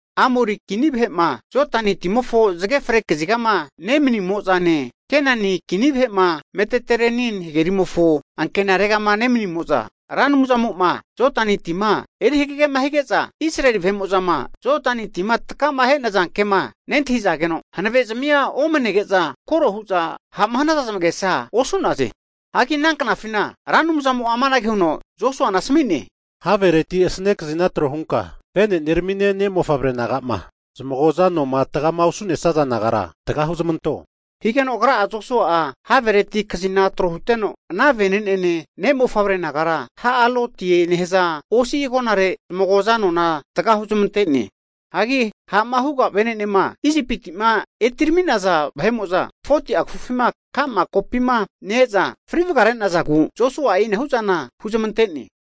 Amori Kini vahe'ma Jodani timofo zage fre kazigama nemanimo'zane, Kenani Kini vahe'ma Meditereniani hagerimofo ankenaregama nemanimo'za, Ra Anumzamo'ma Jodani tima eri hagegema hige'za Israeli vahe'mo'zama Jodani tima takama he'naza kema nentahi'zageno, hanave'zamia omanege'za koro hu'za ha'ma hanaza zamagesa osu'naze. Hagi ana knafina Ra Anumzamo'a amanage huno Josuana asami'ne, Havereti asane kazina trohunka vene'neramine ne'mofavre naga'ma zamagoza anoma tagama osu'nesaza nagara taga huzamanto. Higeno agra'a Josua'a havereti kazina trohuteno, ana vene'nene ne'mofavre nagara Ha'alotie nehaza osi agonare zamagoza anona taga huzmante'ne. Hagi ha'ma huga vene'nema Isipiti'ma etirami'naza vahe'mo'za 40'a kafufima ka'ma kopima ne-eza fri vagare'nazagu Josua'a e'inahu zana huzamante'ne.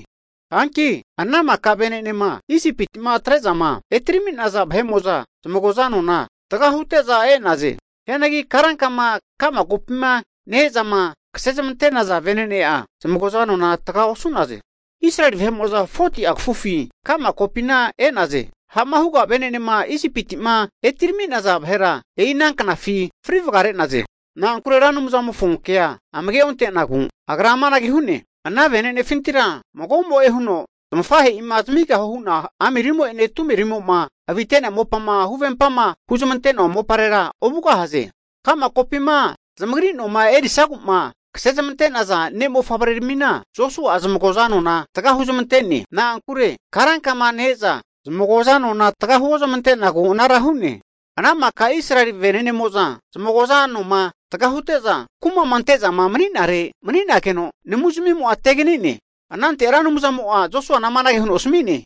Hanki ana maka vene'nema Isipiti'ma atre'zama etirami'naza vahe'mo'za zamagoza anona tagahute'za e'naze. Hianagi karankama ka'ma kopima ne-ezama kasezamante'naza vene'ne'a zamagoza anona taga osu'naze. Israeli vahe'mo'za 40'a kafufi ka'ma kopina e'naze. Ha'ma huga vene'nema Isipiti'ma etirami'naza vahera e'ina knafi fri vagare'naze. Na'ankure Ra Anumzamofo kea amage ontenagu, Agra amanage hu'ne, ana vene'nefintira magomo'e huno zamafahe'ima zamigahue hu'na amirimo'ene tumerimo'ma avite'nea mopama huvempama hu'zmante'noa moparera ovugahaze. Ka'ma kopima zamagri noma erisagu'ma kasezmante'naza ne'mofavre'ramina Josua'a zamagoza anona taga huzamante'ne. Na'ankure karankama ne-eza zamagoza anona taga huozmante'nagu anara hu'ne. Ana maka Israeli vene'nemo'za zamagoza anoma taga hute'za, kuma'ma ante'zama mani'nare mani'nageno, namuzmimo'a tegani'ne. Anante Ra Anumzamo'a Josuana amanage huno asami'ne,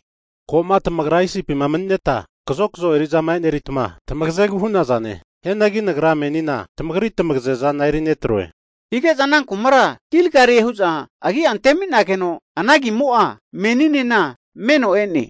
ko'ma tamagra Isipima mani'neta kazokzo eri'zama eneritma tamagazegu hu'nazane. Hianagi Nagra menina tamagri tamagaze zana eri netroe. Hige'za ana kumakura Gilgalie hu'za agia antemi'nageno, ana agimo'a meninena meno e'ne.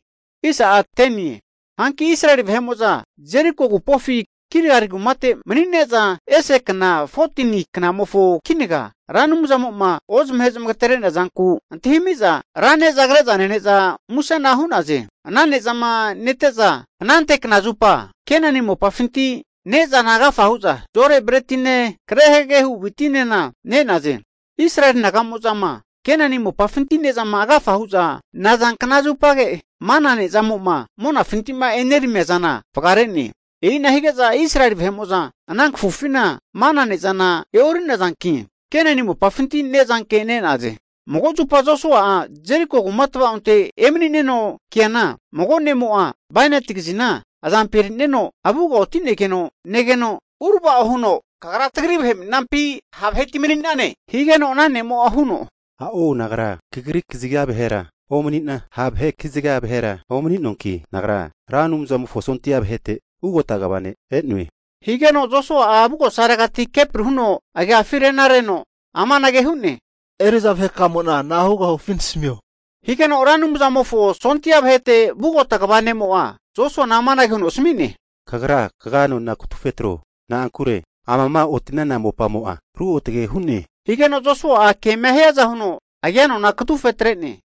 Hanki Israeli vahe'mo'za Jeriko agupofi Gilgali kumate mani'ne'za, ese ikana 14ni knamofo kinaga Ra Anumzamo'ma ozamahe zamagatere'nea zanku antahimi'za ra ne'za kre'za nene'za musena hu'naze. Ana ne'zama nete'za, anante knazupa Kenani mopafinti ne'zana agafa hu'za zo'ore bretine, kre hagege hu witinena ne'naze. Israeli naga'mozama Kenani mopafinti ne'zama agafama hu'za naza knazupage, mana ne'zamo'ma monafinti'ma eneramiazana vagare'ne. E'ina hige'za Israeli vahe'mo'za ana kafufina mana ne'zana e'ori'nazanki, Kenani mopafinti ne'zanke ne'naze. Mago zupa Josua'a Jeriko kuma tvaonte emani'neno keana, mago ne'mo'a bainati kazina azampi eri'neno, avuga oti'negeno negeno urava'o huno, Kagra tagri vahepi, ha' vaheti mani'nane? Higeno ana ne'mo'a huno, A'o nagra kagri kaziga vahera omani'na, ha' vahe kaziga vahera omaninoanki, nagra Ra Anumzamofo sondia vahete ugota kva ne' e'noe. Higeno Josua'a avugosaregati kepri huno agiafi renareno amanage hu'ne, Eri'za vahekamo'na na'a hugahufi nasamio. Higeno Ra Anumzamofo sondia vahete ugota kva ne'mo'a Josuana amanage huno asmi'ne, Kagra kaga nona katufe tro. Na'ankure amama oti'nana mopamo'a ruotage hu'ne. Higeno Josua'a kema hiaza huno agia nona katufetre'ne.